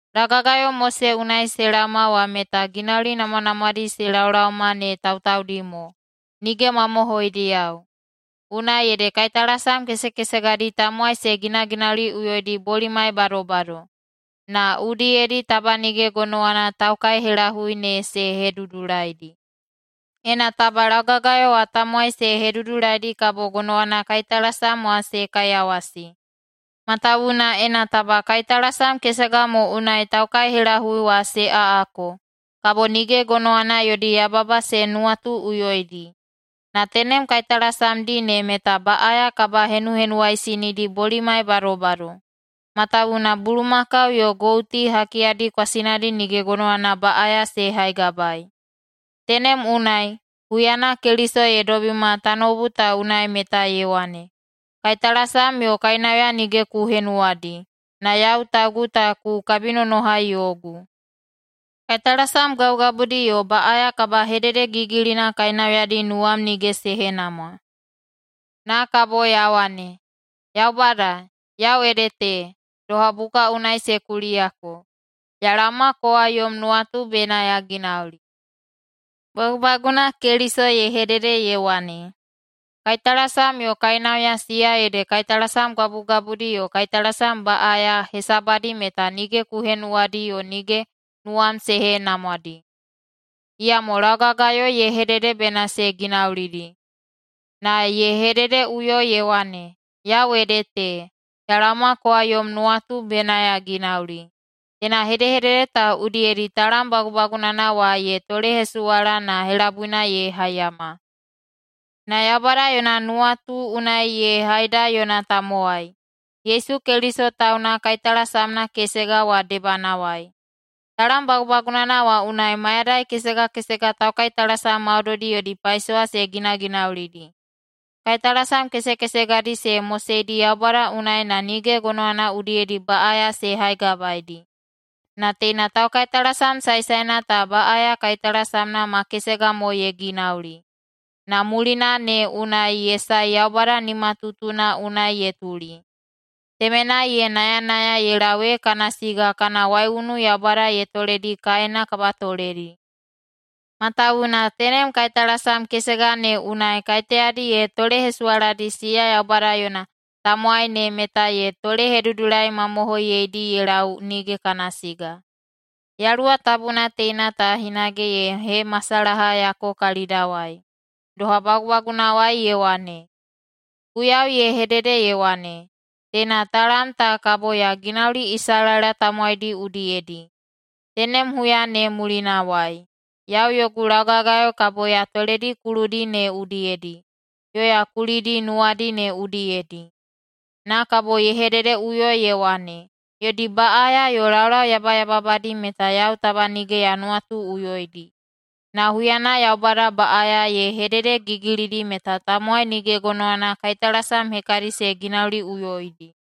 Laugagayo Mose unai se laoma wa meta ginauli namwanamwadi se laolaoma ne tautaudi mo, nige mamohoidiyao. Unai ede kaitalasam kesekesegadi tamowai se ginaginauliꞌuyoidi bolimai badobado, na udiyedi taba nige gonowana taukaihelahui ne se hedudulaidi. Ena taba laugagayo wa tamowai se hedudulaidi kabo gonowana kaitalasam wa se kaiyawasi. Matawuwuna ena taba kaitalasam kesega mo unai taukaihelahui wa se aꞌako, kabo nige gonowana yodi yababa se nuwatuꞌuyoidi. Na tenem kaitalasamdi ne meta baꞌaya kabahenuhenuwaisinidi bolimai badobado, matawuwuna bulumakau yo gouti hakiyadi kwasinadi nige gonowana baꞌaya se haigabae. Tenem unai, huyana Keliso ye dobima tanoubu ta unai meta ye wane, “Kaitalasam yo kainauya nige ku henuwadi, na yau taugu ta ku kabinonohai yogu. Kaitalasam gabugabudi yo baꞌaya kabahededegigilina kainauyadi nuwam nige se henamwa. Na kabo ya wane, ‘Yaubada, yau ede te, doha buka unai se kuliyako, ya laoma kowa yom nuwatu bena ya ginauli.’” Bagubaguna Keliso ye hedede ye wane, “Kaitalasam yo kainauya, siya ede kaitalasam gabugabudi yo kaitalasam baꞌaya hesabadi, meta nige ku henuwadi yo nige nuwam se henamwadi.” Iyamo laugagayo ye hedede bena se ginaulidi Na ye hededeꞌuyo ye wane, “Yau ede te, ya laoma kowa yom nuwatu bena ya ginauli.” Teina hedehedede ta udiyedi talam bagubagunana wa ye tolehesuwala na helabuina ye haiyama. Na Yaubada yona nuwatu unai ye haida yona tamowai, Yesu Keliso tauna kaitalasamna kesega wa debanawai. Talam bagubagunana wa unai mayadai kesega kesega taukaitalasam maudoidi yodi paisowa se ginaginaulidi. Kaitalasam kesekesegadi se moseidi Yaubada unai na nige gonowana udiyedi baꞌaya se haigabaeidi. Na teina taukaitalasam saesaena ta baꞌaya kaitalasamna ma kesega mo ye ginauli, na mulina ne unai ye sae Yaubada nimatutuna unai ye tuli. Temenai ye nayanaya ye lau ee kana siga kana waiunu Yaubada ye toledi kaena kabatoledi. Matawuwuna tenem kaitalasam kesega ne unai kaiteyadi ye tolehesuwaladi siya Yaubada yona tamowai ne meta ye tolehedudulaimamohoiyeidi ye lau nige kana siga. Yaluwa Tabuna teina ta hinage ye hemasalahayako kalidawai. Doha bagubagunawai ye wane, “Guiyau ye hedede ye wane, ‘Teina talam ta kabo ya ginauli Isalaela tamowaidi udiyedi, tenem huya ne mulinawai. Yau yogu laugagayo kabo ya toledi kuludi ne udiyedi yo ya kulidi nuwadi ne udiyedi.’” Na kabo ye hededeꞌuyo ye wane, “Yodi baꞌaya yo laulau yabayababadi meta yau taba nige ya nuwatuꞌuyoidi.” Na huyana Yaubada baꞌaya ye hededegigilidi meta tamowai nige gonowana kaitalasam hekadi se ginauliꞌuyoidi.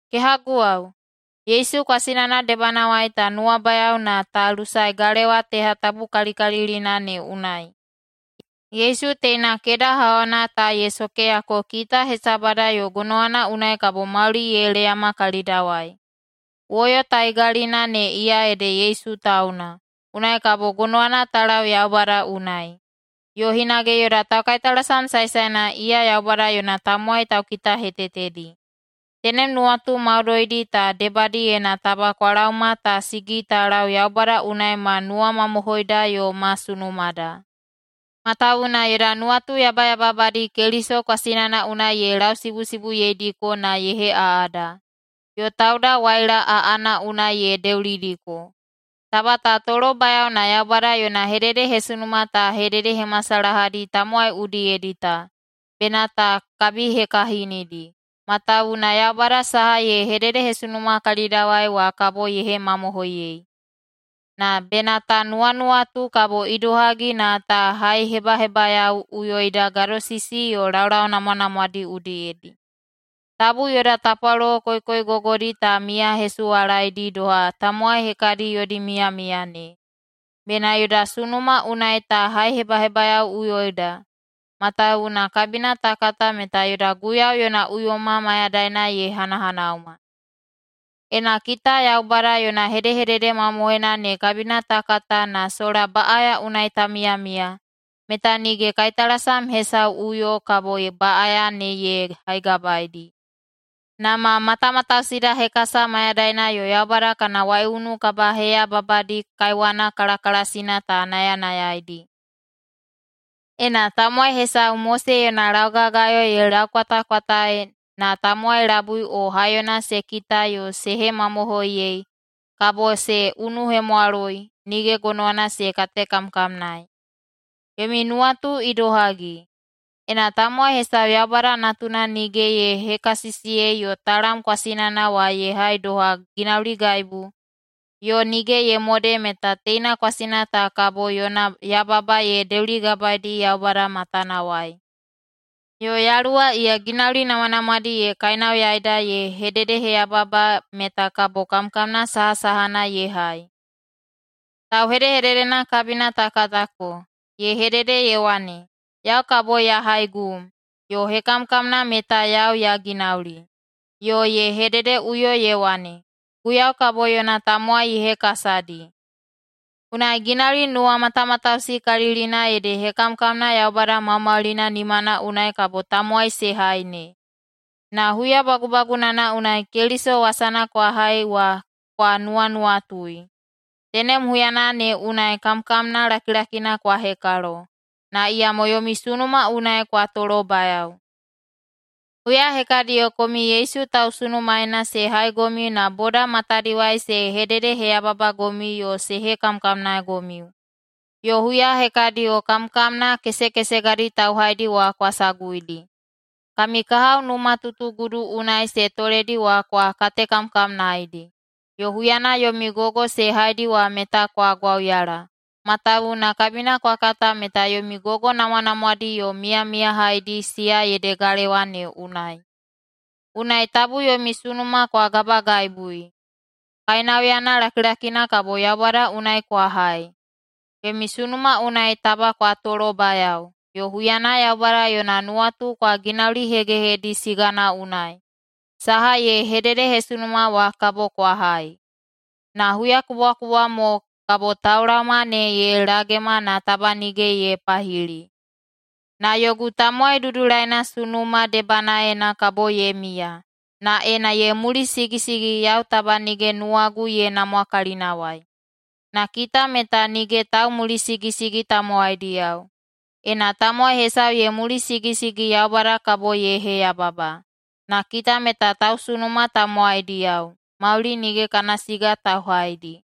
Kehaguwao, Yesu kwasinana debanawai ta nuwabayao na ta lusae galewa teha tabukalikalilina ne unai. Yesu teina keda hauhauna ta ye sokeyako kita hesabada yo gonowana unai kabo mauli ye leyama kalidawai. Woyo taigalina ne iya ede Yesu tauna, unai kabo gonowana ta lau Yaubada unai. Yo hinage yoda taukaitalasam saesaena iya Yaubada yona tamowai taukitahetetedi. Tenem nuwatu maudoidi ta debadiyena taba kwa laoma ta sigi ta lau Yaubada unai ma nuwamamohoida yo ma sunumada. Matawuwuna yoda nuwatu yabayababadi Keliso kwasinana unai ye lausibusibuyeidiko na ye heꞌaꞌada, yo tauda waila aꞌana unai ye deulidiko. Taba ta tolobayao na Yaubada yona hededehesunuma ta hededehemasalahadi tamowai udiyedi ta, bena ta kabihekahinidi, matawuwuna Yaubada saha ye hededehesunuma kalidawai wa kabo ye hemamohoiyei. Na bena ta nuwanuwatu kabo idohagi na ta haihebahebayaoꞌuyoida gadosisi yo laulau namwanamwadi udiyedi. Tabu yoda tapwalolo koikoigogodi ta miyasuwalaedi doha tamowai hekadi yodi miyamiya ne. Bena yoda sunuma unai ta haihebahebayaoꞌuyoida, matawuwuna kabina ta kata meta yoda Guiyau yona uyoma mayadaina ye hanahanauma. Ena kita Yaubada yona hedehedede mamohoina ne kabina ta kata na sola baꞌaya unai ta miyamiya, meta nige kaitalasam hesauꞌuyo kabo baꞌaya ne ye haigabaeidi, na ma matamatausida hekasa mayadaina yo Yaubada kana waiunu kabaheyababadi kaiwana kalakalasina ta nayanayaidi. Ena tamowai hesau Mose yona laugagayo ye laukwatakwataei na tamowai labui o haiyona se kita yo se hemamohoiyei, kabo se unuhemwaloi, nige gonowana se katekamkamnaei. Yomi nuwatu idohagi? Ena tamowai hesau Yaubada Natuna nige ye hekasisiyei yo talam kwasinana wa ye hai doha ginauligaibu, yo nige ye mode meta teina kwasina ta gonowana yona yababa ye deuligabaedi Yaubada matanawai, yo Yaluwa iya ginauli namwanamwadi ye kainauyaida ye hededeheyababa meta kabo kamkamna sahasahana ye hai? Tauhedehededena kabina ta katako, ye hedede ye wane, “Yau kabo ya haigum, yo hekamkamna meta yau ya ginauli,” yo ye hededeꞌuyo ye wane, “Guiyau kabo yona tamowai ye hekasadi.” Unai ginauli nuwamatamatausikalilina ede hekamkamna Yaubada Maumaulina nimana unai kabo tamowai se hai ne. Na huya bagubagunana unai Keliso wasana kwa hai wa kwa nuwanuwatui. Tenem huyana ne unai kamkamna lakilakina kwa hekalo, na iyamo yomi sunuma unai kwa tolobayao. Huya hekadiyo komiu Yesu tausunumaena se haigomiu na boda matadiwai se hededeheyababagomiu yo se hekamkamnagomiu, yo huya hekadiyo kamkamna kesekesegadi tauhaidi wa kwa saguidi. Kami kahao numatutugudu unai se toledi wa kwa katekamkamnaedi, yo huyana yomi gogo se haidi wa meta kwa gwauyala, matawuwuna kabina kwa kata meta yomi gogo namwanamwadi yo miyamiyahaidi, siya ede galewa ne unai. Unai tabu yomi sunuma kwa gabaegaibui. Kainauyana lakilakina kabo Yaubada unai kwa hai. Yomi sunuma unai taba kwa tolobayao, yo huyana Yaubada yona nuwatu kwa ginaulihegehedi sigana unai, saha ye hededehesunuma wa kabo kwa hai. Na huyakubwakubwa mo “kabo taulaoma ne ye lagema na taba nige ye pahili. Na yogu tamowai dudulaina sunuma debanaena kabo ye miya. Na ena ye mulisigisigi yau taba nige nuwagu ye namwa kalinawai.” Na kita meta nige taumulisigisigi tamowaidiyao. Ena tamowai hesau ye mulisigisigi, Yaubada kabo ye heyababa. Na kita meta tausunuma tamowaidiyao, mauli nige kana siga tauhaidi.